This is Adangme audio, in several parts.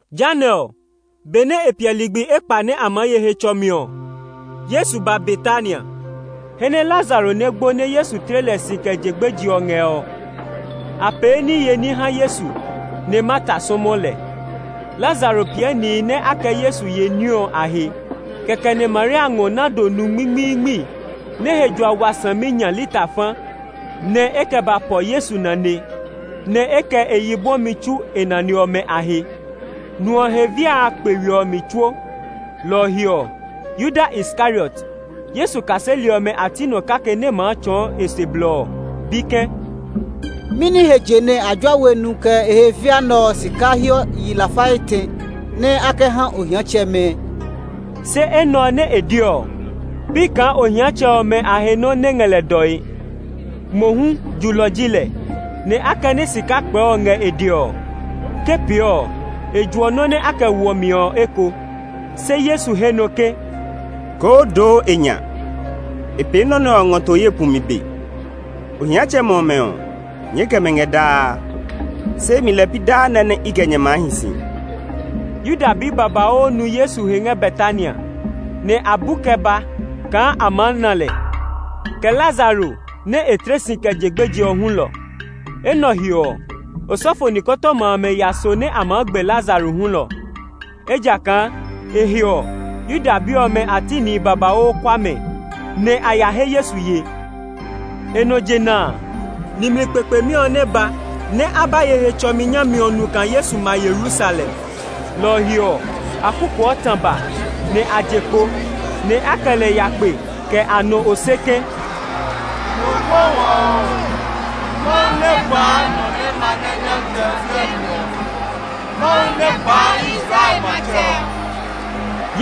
Jehanɛ ɔ, benɛ e piɛ ligbi ekpa nɛ a maa ye Hetsɔmi ɔ, Yesu ba Betania, he nɛ Lazaro nɛ gbo nɛ Yesu tle lɛ si kɛ je gbeje ɔ ngɛ ɔ. A pee niye ní ha Yesu, nɛ Marta sɔmɔ lɛ. Lazaro piɛ nihi nɛ a kɛ Yesu ye ní ɔ a he. Kɛkɛ nɛ Maria ngɔ nardo nu ngmingmiingmi nɛ he jua wa saminya lita fa, nɛ e kɛ ba pɔ Yesu nane, nɛ e kɛ e yi bwɔmi tsu e nane ɔmɛ a he. Nu ɔ he via a kpe we ɔ mi tsuo; lɔ ɔ he ɔ, Yuda Iskariot, Yesu kaseli ɔmɛ a ti nɔ kake nɛ maa tsɔɔ e se blɔ ɔ bi ke, “Mɛni he je nɛ a jua we nu kɛ e he via nɛ ɔ sika hiɔ yi lafa etɛ nɛ a kɛ ha ohiatsɛmɛ?” Se enɛ ɔ nɛ e de ɔ, pi kaa ohiatsɛmɛ ɔmɛ a he nɔ́ nɛ ngɛ lɛ dɔe. Mohu julɔ ji lɛ; nɛ akɛnɛ sika kpɛɛ ɔ ngɛ e dɛ ɔ, ke pee ɔ, e juɔ nɔ́ nɛ a ngɔ woɔ mi ɔ eko. Se Yesu he nɔ ke, “Koo doo e nya; e pee nɔ nɛ ɔ ngɔ to ye pumi be. Ohiatsɛmɛ ɔmɛ ɔ, nyɛɛ kɛ mɛ ngɛ daa, se imi lɛɛ pi daa nɛ i kɛ nyɛ maa hi si.” Yuda bi babauu nu Yesu he ngɛ Betania, nɛ a bu kɛ ba kaa a maa na lɛ, kɛ Lazaro nɛ e tle si kɛ je gbeje ɔ hulɔ. Enɛ ɔ he ɔ, osɔfo nikɔtɔma amɛ ya so nɛ a maa gbe Lazaro hulɔ, ejakaa e he ɔ, Yuda bi ɔmɛ a ti nihi babauu kua mɛ, nɛ a ya he Yesu ye. E nɔ jena a, nimli kpekpemi ɔ nɛ ba nɛ a ba ye Hetsɔmi nyami ɔ nu kaa Yesu ma Yerusalem. Lɔ ɔ he ɔ, a kukuɔ tã ba, nɛ a je kpo, nɛ a kɛ lɛ ya kpe kɛ a nɔ ose ke, “Mo kpɔ wɔ oo! Mawu nɛ gbaa nɔ nɛ ma ngɛ Nyɔmtsɛ ɔ biɛ mi ɔ! Mawu nɛ gbaa Israel matsɛ ɔ!”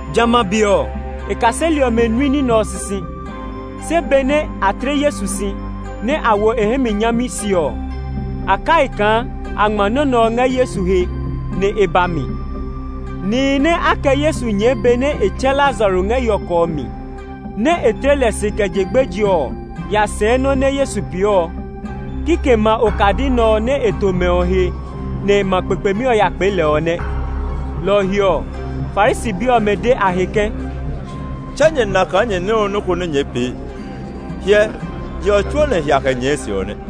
Jamɛ a be ɔ, e kaseli ɔmɛ nui nɔ́ nɛ ɔ sisi; se benɛ a tle Yesu si, nɛ a wo e hɛ mi nyami se ɔ, a kai kaa a ngma nɔ́ nɛ ɔ ngɛ Yesu he, nɛ e ba mi. Nihi nɛ a kɛ Yesu nyɛɛ benɛ e tsɛ Lazaro ngɛ yɔkɔ ɔ mi, nɛ e tle lɛ si kɛ je gbeje ɔ ya sɛɛ nɔ́ nɛ Yesu pee ɔ. Kikɛmɛ a okadi nɛ ɔ nɛ e to mɛ ɔ he nɛ ma kpekpemi ɔ ya kpee lɛ ɔ nɛ. Lɔ ɔ he ɔ, Farisi bi ɔmɛ de a he ke, “Tse nyɛ na kaa nyɛ nyɛ we nɔ́ ko nɛ nyɛɛ pee. Hyɛ, je ɔ tsuo nɛ hia kɛ nyɛɛ e se ɔ nɛ.”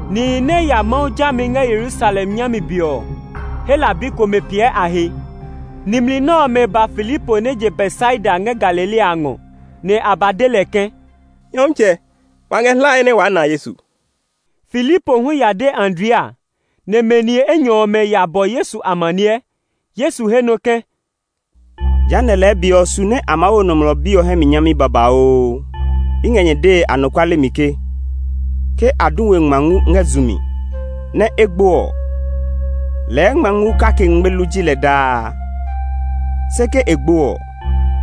Nihi nɛ ya Mawu jami ngɛ Yerusalem nyami be ɔ, Hela bi komɛ piɛ a he. Nimli nɛ ɔmɛ ba Filipo nɛ je Betsaida ngɛ Galilea a ngɔ, nɛ a ba de lɛ ke, “Nyɔmtsɛ, wa ngɛ hlae nɛ waa na Yesu.” Filipo hu ya de Andrea, nɛ mɛ ni enyɔ ɔmɛ a ya bɔ Yesu amaniɛ. Yesu he nɔ ke, “Jehanɛ lɛɛ be ɔ su nɛ a maa wo Nɔmlɔ Bi ɔ hɛ mi nyami babauu. I ngɛ nyɛ dee anɔkuale mi ke, ke a du we ngma ngu ngɛ zu mi, nɛ e gbo ɔ, lɛɛ ngma ngu kake ngmelu ji lɛ daa. Se ke e gbo ɔ,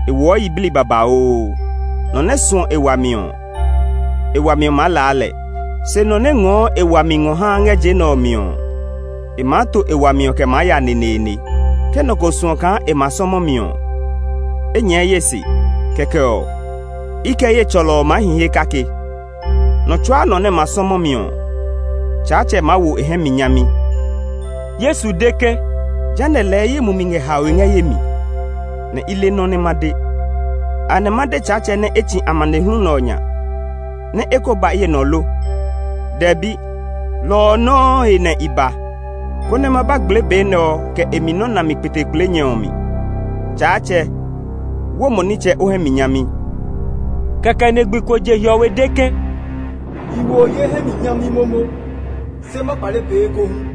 e woɔ yiblii babauu. Nɔ nɛ suɔ e wami ɔ, e wami ɔ maa laa lɛ; se nɔ nɛ ngɔɔ e wami ngɔ haa ngɛ je nɛ ɔ mi ɔ, e maa to e wami ɔ kɛ maa ya neneene. Ke nɔ ko suɔ kaa e ma sɔmɔ mi ɔ, e nyɛɛ ye se, kɛkɛ ɔ, i kɛ ye tsɔlɔ ɔ maa hi he kake. Nɔ tsuaa nɔ nɛ ma sɔmɔ mi ɔ, Tsaatsɛ maa wo e hɛ mi nyami.” Yesu de ke, “Jehanɛ lɛɛ ye mumi ngɛ haoe ngɛ ye mi, nɛ i li nɔ nɛ ma de. Anɛ ma de Tsaatsɛ nɛ e tsi amanehlu nɛ ɔ nya nɛ e ko ba ye nɔ lo? Dɛbi! Lɔ ɔ nɔuu he nɛ i ba, konɛ ma ba gblee be nɛ ɔ kɛ e mi nɔ́ nami kpetekpleenyɛ ɔ mi. Tsaatsɛ, wo mo nitsɛ o hɛ mi nyami!” Kɛkɛ nɛ gbi ko je hiɔwe de ke, “I wo ye hɛ mi nyami momo, se ma kpale pee ekohu.”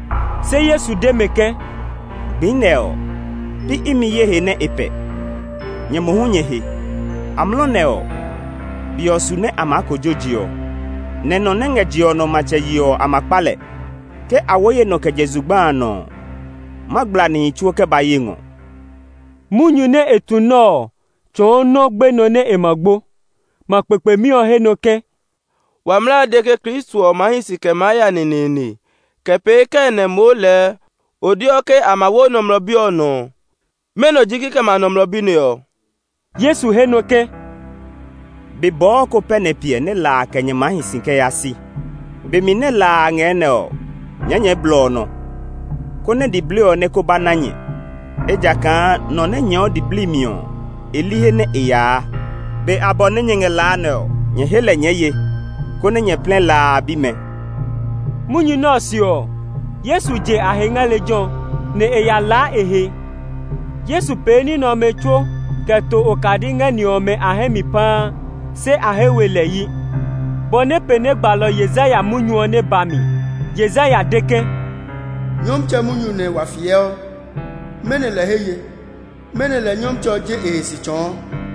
Se Yesu de mɛ ke, “Gbi nɛ ɔ, pi imi ye he nɛ e pɛ, nyɛ mohu nyɛ he. Amlɔ nɛ ɔ, be ɔ su nɛ a maa kojo je ɔ, nɛ nɔ nɛ ngɛ je ɔ nɔ matsɛ yee ɔ, a ma kpa lɛ. Ke a wo ye nɔ kɛ je zugba a nɔ ɔ, ma gbla nihi tsuo kɛ ba ye ngɔ.” Munyu nɛ e tu nɛ ɔ tsɔɔ nɔ gbenɔ nɛ e ma gbo. Ma kpekpemi ɔ he nɔ ke, “Wa mlaa a de ke Kristo ɔ maa hi si kɛ maa ya neneene. Kɛ pee kɛɛ nɛ moo lɛɛ o deɔ ke a ma wo Nɔmlɔ Bi ɔ nɔ ɔ? Mɛnɔ ji kikɛmɛ a Nɔmlɔ Bi nɛ ɔ?” Yesu he nɔ ke, “Be bɔɔ ko pɛ nɛ e piɛ nɛ la a kɛ nyɛ maa hi si kɛ yaa si. Be mi nɛ la a ngɛ nɛ ɔ, nyɛɛ nyɛɛ blɔ ɔ nɔ, konɛ diblii ɔ nɛ ko ba na nyɛ, ejakaa nɔ nɛ nyɛɛɔ diblii mi ɔ, e li he nɛ e yaa. Be abɔ nɛ nyɛ ngɛ la a nɛ ɔ, nyɛ he lɛ nyɛɛ ye, konɛ nyɛ plɛ la a bimɛ.” Yuda bi ɔmɛ he we yi Munyu nɛ ɔ se ɔ, Yesu je a he ngɛ lejɛ ɔ, nɛ e ya laa e he. Yesu pee ní nɛ ɔmɛ tsuo kɛ to okadi ngɛ ni ɔmɛ a hɛ mi paa, se a he we lɛ yi, bɔ nɛ pee nɛ gbalɔ Yesaya munyu ɔ nɛ ba mi. Yesaya de ke, “Nyɔmtsɛ, munyu nɛ wa fiɛ ɔ, mɛnɔ lɛ he ye? Mɛnɔ lɛ Nyɔmtsɛ ɔ je e he si tsɔɔ?”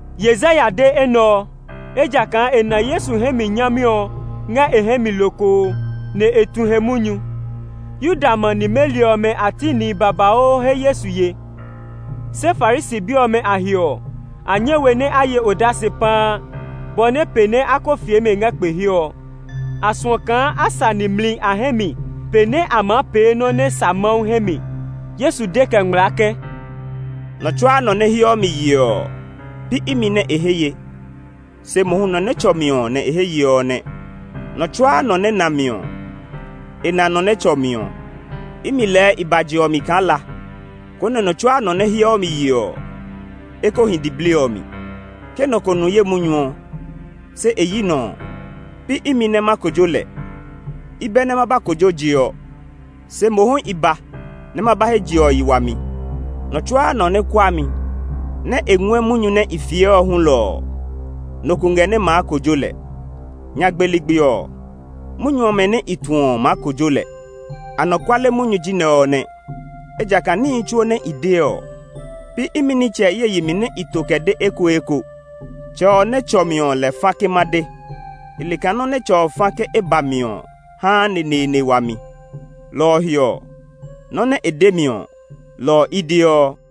Yesaya de enɛ ɔ, ejakaa e na Yesu hɛ mi nyami ɔ ngɛ e hɛ mi lokoo, nɛ e tu he munyu. Yuda ma nimeli ɔmɛ a ti nihi babauu he Yesu ye, se Farisi bi ɔmɛ a he ɔ, a nyɛ we nɛ a ye odase paa, bɔ nɛ pee nɛ a ko fie mɛ ngɛ kpe he ɔ. A suɔ kaa a sa nimli a hɛ mi pe nɛ a maa pee nɔ nɛ sa Mawu hɛ mi. Yesu de kɛ ngmlaa ke, “Nɔ tsuaa nɔ nɛ heɔ mi yeɔ ɔ, pi imi nɛ e he ye, se mohu nɔ nɛ tsɔ mi ɔ nɛ e he ye ɔ nɛ. Nɔ tsuaa nɔ nɛ na mi ɔ, e na nɔ nɛ tsɔ mi ɔ. Imi lɛɛ i ba je ɔ mi kaa la, konɛ nɔ tsuaa nɔ nɛ heɔ mi yeɔ ɔ, e ko hi diblii ɔ mi. Ke nɔ ko nu ye munyu ɔ, se e yi nɔ ɔ, pi imi nɛ ma kojo lɛ. I bɛ nɛ ma ba kojo je ɔ; se mohu i ba nɛ ma ba he je ɔ yi wami. Nɔ tsuaa nɔ nɛ kua mi, nɛ e ngɔɛ munyu nɛ i fiɛ ɔ hulɔ ɔ, nɔ ko ngɛ nɛ maa kojo lɛ. Nyagbe ligbi ɔ, munyu ɔmɛ nɛ i tu ɔ maa kojo lɛ. Anɔkuale munyu ji nɛ ɔ nɛ, ejakaa níhi tsuo nɛ i de ɔ, pi imi nitsɛ ye yi mi nɛ i to kɛ de ekoeko. Tsɛ ɔ nɛ tsɔ mi ɔ lɛ fa ke ma de. I le kaa nɔ́ nɛ Tsɛ ɔ fa ke e ba mi ɔ haa neneene wami; lɔ ɔ he ɔ, nɔ́ nɛ e de mi ɔ, lɔ ɔ i deɔ.”